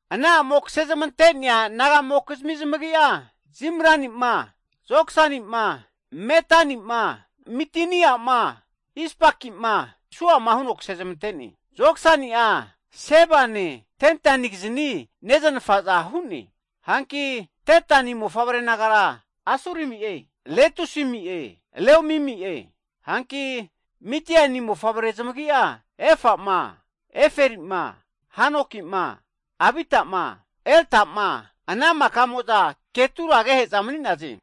Ana a'mo kse zamante'nea naga'mokizmi zamagi'a Zimran, Joksan, Medan, Midian, Ispak, Suaki'e, huno zamante'ne. Joksani'a, Seba'ne, Dedani kizni neznafaza hu'ne. Hanki, Dedani mofavre nagara Asurimi'e, Letusimi'e, Leumimi'e. Hanki, Midiani mofavre zamagi'a Efa'ma, Eferi'ma, Hanoki'ma, Abita'ma, Elda'ma, Ana maka'mo'za Ketura agehe'za mani'naze.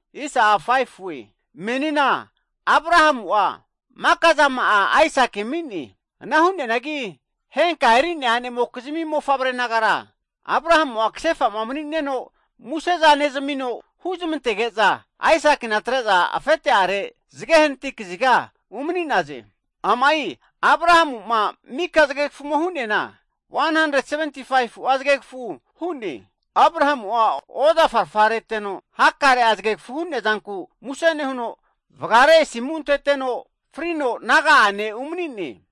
Menina, Abrahamu'a maka zama'a Aisaki ami'ne, ana hu'neanagi henka eri'nea a'nemokizmi mofavre nagara, Abrahamu ksefa mani'neno muse'za nezmino huzmantege'za, Aisaki atre'za afete'are zge hanati kaziga umani'naze. Amai Abrahamu mika zgegfu hu'neana 175fu'a zgegfu hu'ne. Abrahamu ozafa'rfa reteno hakare'a zgegfu hu'neazanku muse nehuno, vgare asimu anteteno frino naga'ane umani'ne.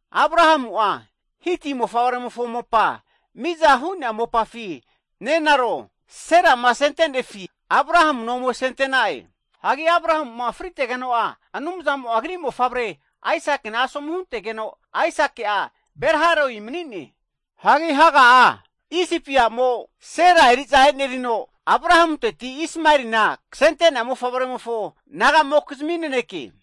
Abrahamu, Hiti mofavremofo mopa miza hu'nea mopafi, nenaro Sera asente'nefi Abrahamuna ome asente'na'e. Hanki, Abrahamu fritegeno'a Anumzamo agri ne'mofavre'a Aisakina asomu huntegeno, Aisaki'a Ber-hai-roi mani'ne. Hega Isipi a'mo Sera eri'za enerino Abrahamunteti, Ismaelina ksente'nea mofavremofo naga'mokizmi naneke.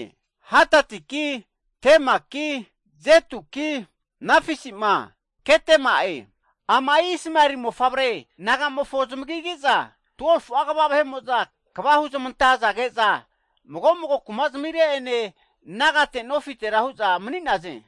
Hadadi'ki, Tema'ki, Jetuki, Nafisi'ma, Kedema'e. Amai Ismaeli ne'mofavre nagamofo zamagine, kuma'zmine, 12fu'a kva zamine, nofite nagate hu'za mani'naze.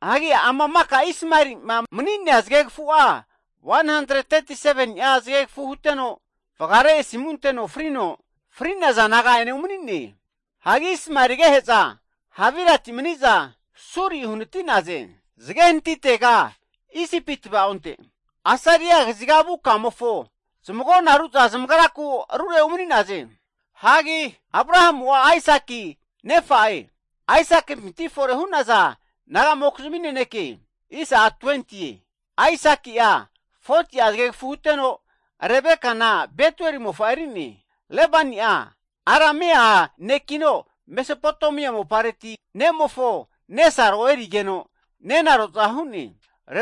Ama maka Ismaeli mani'nea zgegfu'a 137ni'a zgegfu huteno, vgare asimu anteno frino, fri'naza naga'ane umani'ne. Hanki, Ismaeli agehe'za Havilati mani'za Suri uhanati'naze, zge hanati'tega Isipi tvaonte, Asiri'a kaziga vu kamofo, zamagonaru'za zamagraku arure umani'naze. Abrahamu'a Aisaki nefa'e. Aisaki'pinti fore hu'naza naga'mokizmi naneke. Aisaki 40ti'a zgegfu huteno Rebekana Betueli mofa erine, Lebani'a Aramea nera, Mesopotamia mopareti ne'mofo nesaro erigeno, nenaro'za hu'ne.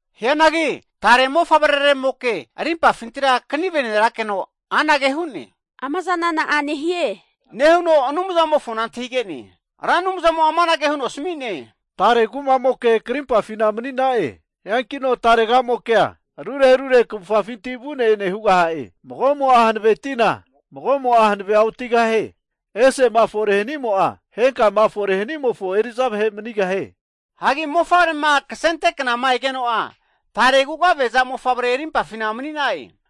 Hianagi tare mofavremo arimpafinti knime nerakeno, amazana na'a nehie nehuno Anumzamofo antahige'ne. Ra Anumzamo amanage huno asmi'ne, tare kumamoke krimpafi mani'na'e, hankino tare'mokea arure arure kvufga'finti vune ene hugaha'e, mago'mo'a hanvetina, mago'mo'a hanve otigahie, hanigeno ramo'a, osimofo katoza hugahie. Mofavre ksente kna'ma egeno'a, tare kugaveza mofavre arimpafi mani'na'e.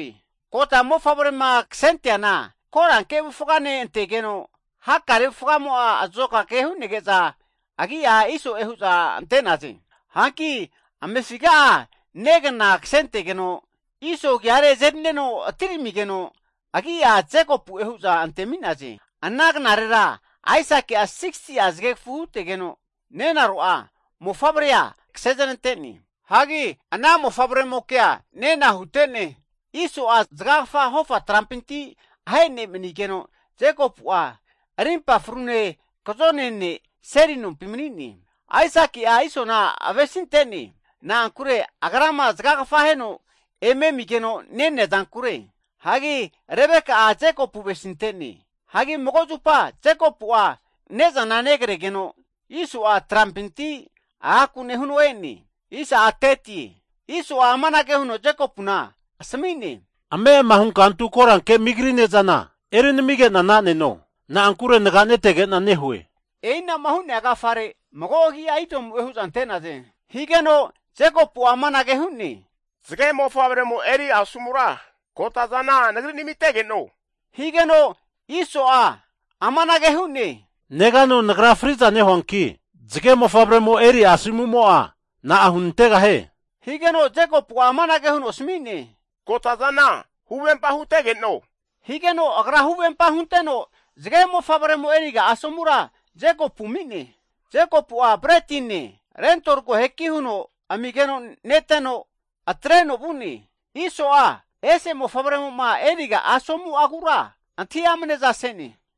Kota mofavrema ksenteana koranke avufgane ante'ne, hakare avufgamo'a azokake hu'nege'za agi'a Isoe hu'za ante'naze. Hanki amefiga'a negna ksentegeno, Iso agiare azerino atiramigeno, agi'a Jekopu'e hu'za antemi'naze. Ana knarera Aisaki'a 60ti'a zgegfu hutegeno nenaro mofavre kse znante'ne. Ana mofavre'moke nena hute'ne, Iso'a zgagfa hofa trampinti ahe ne' mani'negeno, Jekopu'a rimpa frune, kzone ne' seli nompi mani'ne. Aisaki'a Isona avesinte'ne, na'ankure agrama zgagfa aheno eme amigeno nenea zankure, hagi Rebeka'a Jekopu avesinte'ne. Jekopu'a ne'za negregeno Iso'a trampinti agaku nehuno e'ne, Iso'a, Jekopu amanage huno asmi'ne, ame'ama hunka antu koranke migri (sup) ne'zana eri namige'na na'neno, na'ankure naganetege'na nehue, ana hu'negu agi'a Idomu'e. Higeno Jekopu amanage hu'ne, zge mofavremo eri asomura kota'zana nagri nmitegeno. Iso amanage hu'ne, Negano nagra friza nehue, zge mofavremofo asomumo'a na'a hunantegahie? Jekopu amanage huno asmine, kotazana huvempa hutegeno higeno, agra huvempa hunteno zge mofavremo eriga asomura Jekopu ami'ne. Jekopu'a bretine, lentol koheki huno amigeno neteno atreno vu'ne. Iso'a, agra'a asomukura antahi amneza se'ne.